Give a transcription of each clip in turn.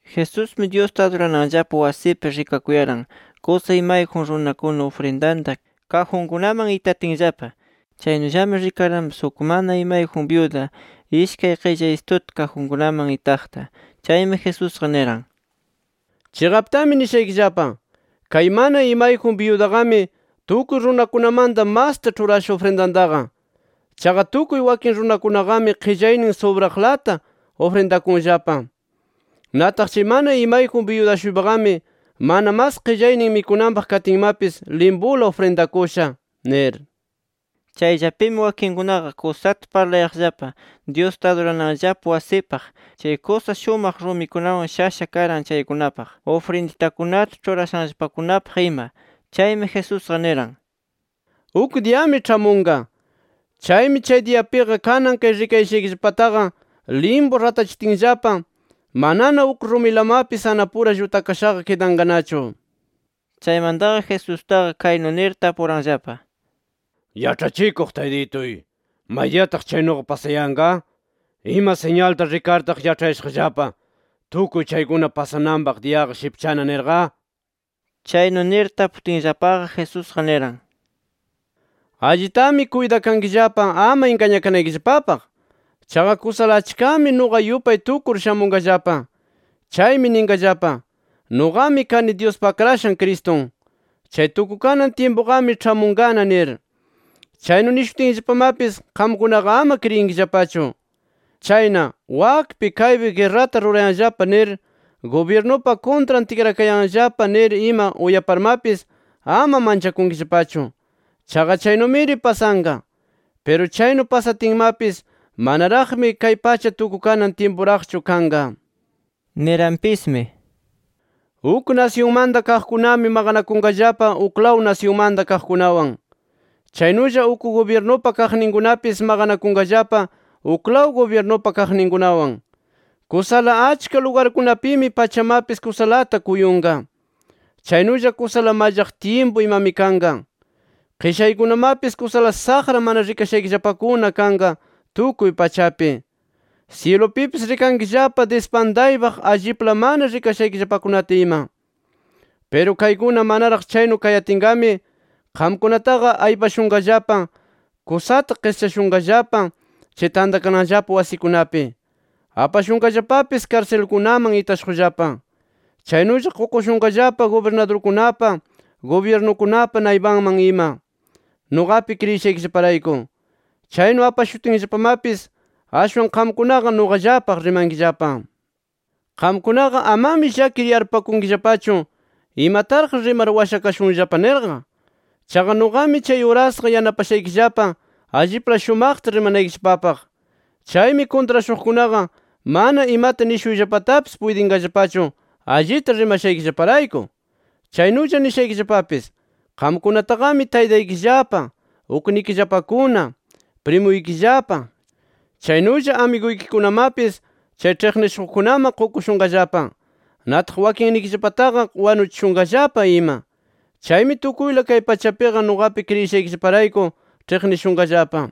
Jesusmi, Dyusta adurananllapa wasipi, rikakuyaran kusa imayjun runakuna, ufrindanta kajunkunaman itatinllapa. Chaynullami rikaranpis uk mana imayjun byuda ishkay qillaysituta kajunkunaman itaqta. Chaymi Jesusqa niran: —Chiqaptami nishaykillapa: Kay mana imayjun byudaqami, tukuy runakunamanta masta ĉhurasha ufrindantaqa. Chaqa, tukuy wakin runakunaqami qillaynin subraqlata ufrindakunllapa. Nataq chay mana imayjun byuda-shuypaqami, mana mas qillaynin mikunanpaq katinmapis, limpula ufrindakusha nir. Chayllapimi, wakinkunaqa kusata parlayaqllapa Dyusta adurananllapa wasipaq, chay kusa shumaq rumikunawan shasha karan chaykunapaq, ufrinditakunata ĉhurashanllapakunapaq ima. Chaymi Jesusqa niran: “Uk diyami ĉhamunqa. Chaymi chay diyapiqa kanan kay rikayashaykillapataqa limpu ratachitinllapa, manana uk rumilamapis anapura llutakashaqa kidanqanachu” nir. Chaymantaqa Jesustaqa kaynu nir tapuranllapa: —Yaĉhachikuq Taytituy, ¿maydiyataq chaynuqa pasayanqa? ¿Ima siñalta rikartaq yaĉhayashaqllapa, tukuy chaykuna pasananpaq diyaqa shipchana? nirqa. Chaynu nir taputinllapaqa Jesusqa niran: “Allitami kuytakankillapa ama ingañakanaykillapapaq. Chaqa kusala achkami nuqa yupay tukur shamunqallapa. Chaymi ninqallapa: ‘Nuqami kani Dyuspa Akrashan Cristun’. ‘Chay tukukanan tyimpuqami ĉhamunqana’ nir. Chaynu nishutinllapamapis, qamkunaqa ama kriyinkillapachu. Chayna, wakpi kaypi guerrata rurayanllapa nir, gubyirnupa kuntran tikrakayanllapa nir ima uyaparmapis, ama manchakunkillapachu. Chaqa chaynumiri pasanqa. Piru chaynu pasatinmapis manaraqmi kay pacha tukukanan tyimpuraqchu kanqa”. Niranpismi: “Uk nasyunmanta kaqkunami maqanakunqallapa uklaw nasyunmanta kaqkunawan. Chaynulla uk gubyirnupa kaqninkunapis maqanakunqallapa uklaw gubyirnupa kaqninkunawan. Kusala achka lugarkunapimi pachamapis kusalata kuyunqa. Chaynulla kusala mallaq tyimpu imami kanqa. Qishaykunamapis kusala saqra mana rikashaykillapakuna kanqa, tukuy pachapi. Syilupipis rikankillapa dispantaypaq allipla mana rikashaykillapakunata ima. “Piru kaykuna manaraq chaynu kayatinqami, qamkunataqa aypashunqallapa, kusata qischashunqallapa chay tantakananllapa wasikunapi. Apashunqallapapis karsilkunaman itashuqllapa. Chaynulla qukushunqallapa gubirnadurkunapa, gubyirnukunapa naypanman ima nuqapi kriyishaykillaparayku. Chaynu apashutinllapamapis ashwan qamkunaqa nuqallapaq rimankillapa. Qamkunaqa, amami llakir yarpupakunkillapachu imataraq rimar washakashunllapa nirqa. Chaqa, nuqami chay urasqa yanapashaykillapa allipla shumaqta rimanaykillapapaq. Chaymi kuntrashuqkunaqa mana imata nishuyllapatapis puytinqallapachu, allita rimashaykillaparayku. “Chaynulla nishaykillapapis: Qamkunataqami taytaykillapa, uknikillapakuna, primuykillapa, chaynulla amiguykikunamapis chay ĉhiqnishuqkunaman qukushunqallapa. Nataq wakinnikillapallataqa wanuchishunqallapa ima. Chaymi tukuyla kay pachapiqa nuqapi kriyishaykillaparayku ĉhiqnishunqallapa.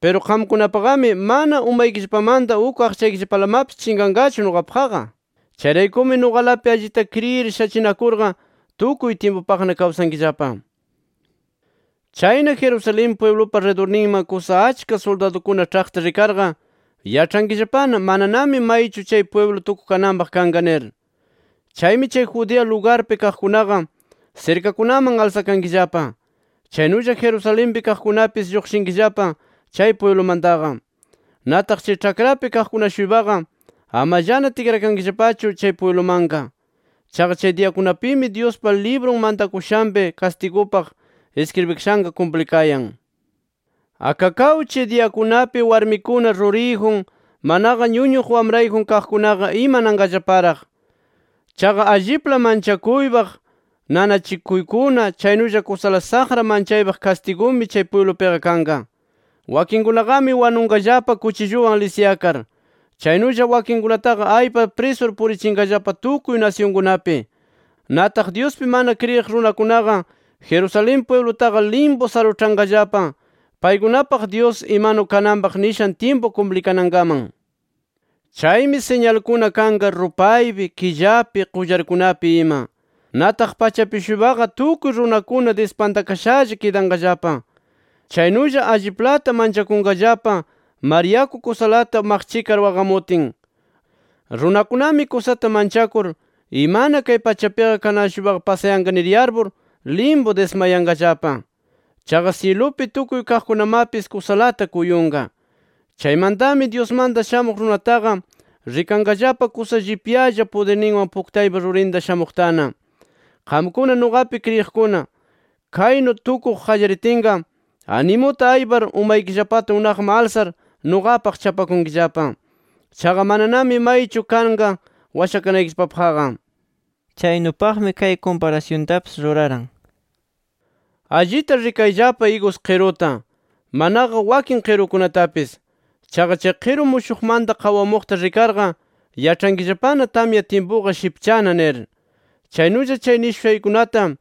Piru qamkunapaqami, mana umaykillapamanta uk aqchaykillapalamapis chinqanqachu nuqapaqqa. Chayraykumi nuqalapi allita kriyir shachinakurqa tukuy tyimpupaqna kawsankillapa. “Chayna, Jerusalén pwiblupa ridurninman kusa achka suldadukuna ĉhaqta rikarqa, yaĉhankillapana mananami maychu chay pwiblu tukukananpaq kanqa nir. Chaymi chay Judea lugarpi kaqkunaqa, sirkakunaman alsakankillapa. Chaynulla, Jerusalenpi kaqkunapis lluqshinkillapa chay pwiblumantaqa. Nataq, chay ĉhakrapi kaqkuna-shuypaqa amallana tikrakankillapachu chay pwiblumanqa. Chaqa chay diyakunapimi, Dyuspa librun mantakushanpi kastigupaq iskribikashanqa kumplikayan. ¡Akakaw chay diyakunapi warmikuna ruriyjun, manaqa ñuñuq wamrayjun kaqkunaqa imananqallaparaq! Chaqa allipla manchakuypaq nanachikuykuna chaynulla kusala saqra manchaypaq kastigumi chay pwiblupiqa kanqa. Wakinkunaqami wanunqallapa kuchilluwan lisyakar, chaynulla wakinkunataqa aypar prisur purichinqallapa tukuy nasyunkunapi. Nataq, Dyuspi mana kriyiq runakunaqa, Jerusalén pwiblutaqa limpu saruĉhanqallapa, paykunapaq Dyus imanu kananpaq nishan tyimpu kumplikanankaman. “Chaymi siñalkuna kanqa rupaypi, killapi, qullarkunapi ima. Nataq pachapi-shuypaqa tukuy runakuna dispantakashalla kidanqallapa. Chaynulla alliplata manchakunqallapa, mar yaku kusalata maqchikar waqamutin. Runakunami kusata manchakur, imana kay pachapiqa kanan-shuypaqa pasayanqa nir yarpur, limpu dismayanqallapa. Chaqa syilupi tukuy kaqkunamapis kusalata kuyunqa. Chaymantami Dyusmanta Shamuq Runataqa rikanqallapa kusa llipyalla pudirninwan puktaypa rurinta shamuqtana. Qamkuna nuqapi kriyiqkuna, kaynu tukuq qallaritinqa, animuta aypar umaykillapata unaqman alsar nuqapaq chapakunkillapa. Chaqa mananami maychu kanqa washakanaykillapapaqqa”. Chaynupaqmi, kay kumparasyuntapis ruraran: “Allita rikayllapa igus qiruta, manaqa wakin qirukunatapis. Chaqa chay qiru mushuqmanta qawamuqta rikarqa, yaĉhankillapana tamya tyimpuqa shipchana nir. Chaynulla chay nishushaykunata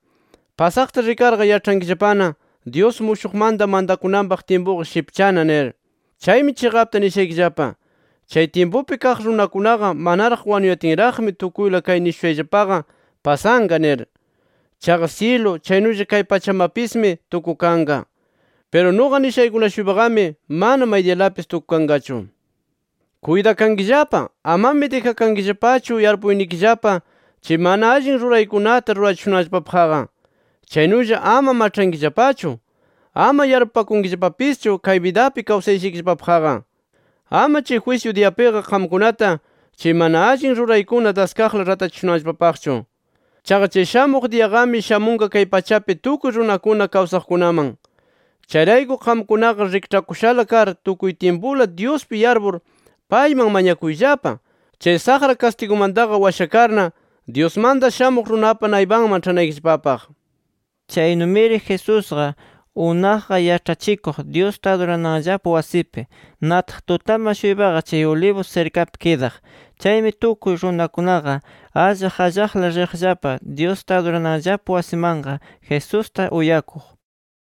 pasaqta rikarqa, yaĉhankillapana Dyus mushuqmanta mantakunanpaq tyimpuqa shipchana nir. “Chaymi chiqapta nishaykillapa: Chay tyimpupi kaq runakunaqa manaraq wanuyatinraqmi tukuyla kay nishushayllapaqa pasanqa nir. Chaqa syilu chaynulla kay pachamapismi tukukanqa. Piru nuqa nishaykuna-shuypaqami mana maydiyalapis tukukanqachu. Kuytakankillapa, amami dijankillapachu yarpuynikillapa chay mana allin ruraykunata rurachishunanllapapaqqa. Chaynulla ama maĉhankillapachu, ama yarpupakankillapapischu kay bidapi kawsayashaykillapapaqqa. Ama chay jwisyu diyapiqa qamkunata, chay mana allin ruraykuna daskaqla ratachishunanllapapaqchu. Chaqa chay shamuq diyaqami shamunqa kay pachapi tukuy runakuna kawsaqkunaman. Chayrayku, qamkunaqa rikĉhakushala kar tukuy tyimpula Dyuspi yarpur, payman mañakuyllapa chay saqra kastigukunamantaqa washakarna, Dyusmanta Shamuq Runapa naypanman ĉhanaykillapapaq”. Chaynumiri Jesusqa, unaqqa yaĉhachikuq Dyusta adurananllapa wasipi. Nataq, tutaman-shuypaqa chay Olivos sirkapi kidaq. Chaymi, tukuy runakunaqa allaq allaqla riqllapa Dyusta adurananllapa wasimanqa, Jesusta uyakuq.